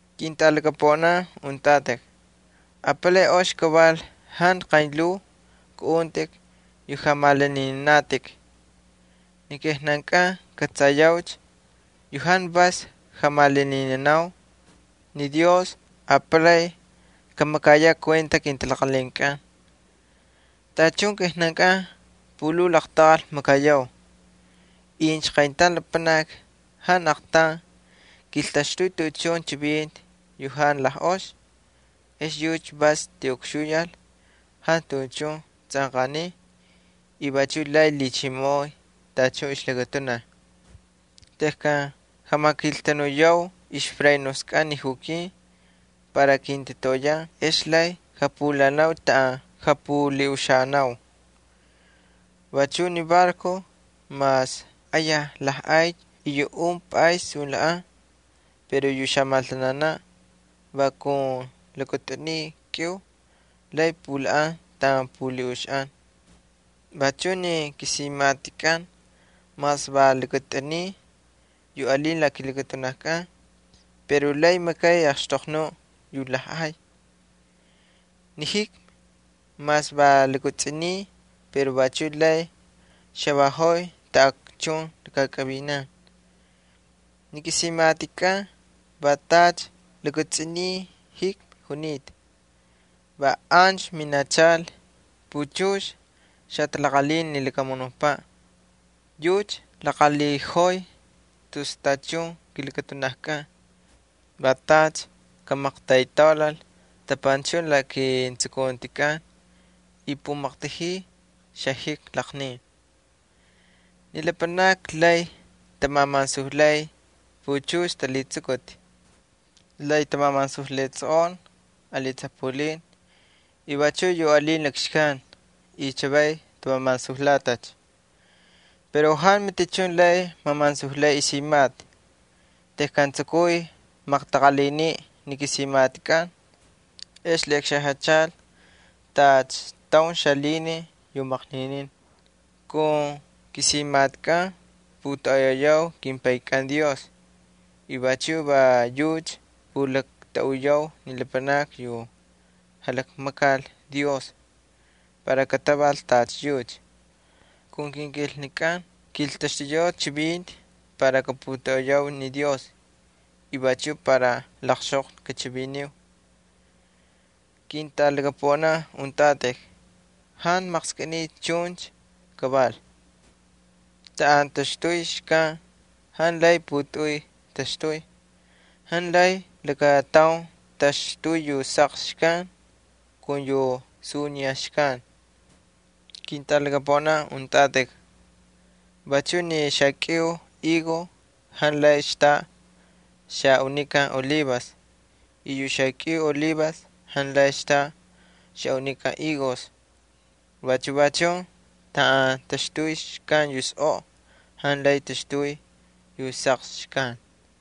Ketꞌalaqaunin, apalay ox kaval jantu qaynlhuu kꞌaꞌuntꞌik yu jamalaninanatꞌik. Ni kijnan kꞌatsayaucha yu jantu vas jamalaninanau, ni Dios apalay kamakayaꞌ kuenta kintalaqalhinkꞌan. Tachun kijnan pulhuu laqtaqal makayau. Incha qayntaun lapanaki jantu aqtaun kiltaxtuy tuꞌuchun chivinti yu jantu ox, ex yucha vas tiꞌukxuyal, jantu tuꞌuchun tsꞌanqaniy y vachuꞌ lay lhichimoꞌoy tachun ixlakatunaj. Tejkan jamakiltanuyau ixfrenoskꞌan ni jukin para kintatoꞌoyan ex lay japulhaꞌanau taꞌan japulhiꞌuxaꞌanau. Vachu ni barcos, mas ayaj lajꞌay y yu un pꞌays sunlhaꞌan, pero yu xamaltananaꞌ va kun lakatꞌuniy kꞌiu lay pulhaꞌan taꞌan pulhiꞌuxaꞌan. Vachu ni kisimaꞌatikꞌan mas va lakatꞌuniy yu alin la kilakatunajkꞌan pero lay makay axtoqnuꞌ yu lajꞌay. Ni jikmi mas va lakatsꞌuniy pero vachu lay xavaꞌojoy taꞌakchun lakakꞌavinan. Ni kisimaꞌatikꞌan va tacha lakatsꞌuniy jikmi junita. Va ancha minachal puchux xatalaqalhin ni lakamunukpaꞌ. Yucha laqalhiꞌojoy tus tachun kilakatunajkꞌan, va tacha kamaqtaytaulal tapanchun la ketsukuntikꞌan y pumaqtajiy xajikmi laqnin. Ni lapanakni lay tamamansujlay puchux talhitsukuti, lay tamamansujlay tsꞌoꞌon ali tsapulin y vachuꞌ yu alin lakxkan y chavay tamamansujlatacha. Pero jantu matichun lay mamansujlay isimaꞌati. Tejkan tsukuy maqtaqalhiniꞌ ni simaꞌati ex lhiꞌakxajachal tacha kꞌalhitsꞌukꞌucha taun xalhinin para kꞌamaqnin. Kun kisimaꞌatikꞌan putoꞌoyayau kimPaykꞌan Dios y vachu va yucha pulaktuꞌuyau ni lapanakni yu jalakmakal Dios para kataval tacha yucha. Kun kinkilnakꞌan kiltaxtuyau chivinti para kaputoꞌoyau ni Dios y vachuꞌ para laqxtoqnuꞌ kachiviniu. Ketꞌalaqaunin, jantu maqskꞌiniy chuncha kaval. Taꞌan taxtuy xkan jantu lay putꞌuy taxtuy. Jantu lay lakataun taxtuy yu saqsi xkan kun yu suniya xkan. Ketꞌalaqaunin, vachu ni xakꞌiu higo jantu lay xtaꞌa xaꞌunikan olivas y yu xakꞌiu olivas jantu lay xtaꞌa xaꞌunikan higos. Vachu va chun taꞌan alin xkan yu sꞌoꞌo jantu lay taxtuy yu saqsi xkan.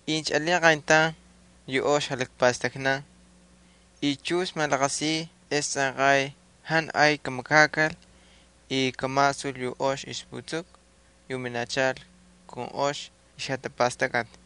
Incha alin qayntaun yu ox jalakpastaknan y chux malaqasiy ex tsꞌanqay jantu ay kamakakal y kamasul yu ox ixputsuku yu minachal kun ox ixjatapastakꞌati.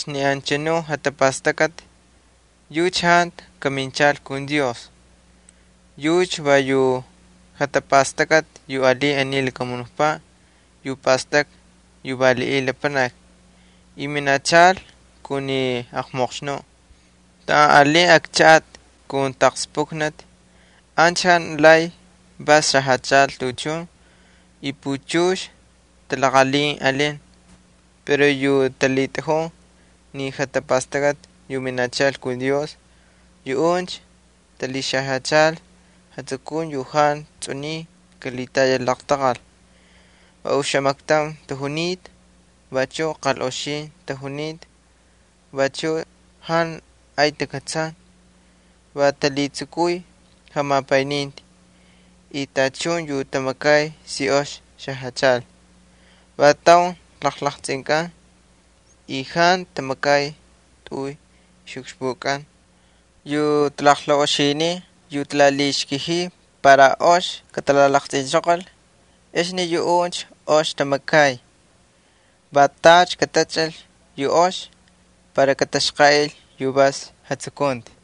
Ni anchanu jatapastakꞌati yucha jantu kaminchal kun Dios, yucha va xajatapastakꞌati aniy lakamunukpaꞌ yu pastakꞌa yu valiꞌiy lapanaki y minachal kun ni aqmoqxnuꞌ. Taꞌan alin akchaꞌati kun taqspukniti ancha jantu lay vas xajachal tuꞌuchun y puchux talaqalhin alin. Pero yu talhitꞌajun ni jatapastakꞌati yu minachal kun Dios yuꞌuncha talhixajyachal jatsukunti yu jantu tsꞌuniy kalhitayal laqtaqal, va oxamaktaun tajunita, vachu qalꞌox tajunita, vachu jantu ay takꞌatsan, va talhitsukuy jamapayninti, tachun yu tamakay si ox xajachal, va taun jalaqtsꞌinkan y jantu tꞌuy ukxpu tamakay. Yu talaqlaꞌoxinin yu talalhixkajiy para ox katalalaqtsꞌinchoqol, yuꞌuncha ox tamakay. Va tacha katachꞌal yu ox para kataxqaꞌil yu vas jatsukunti.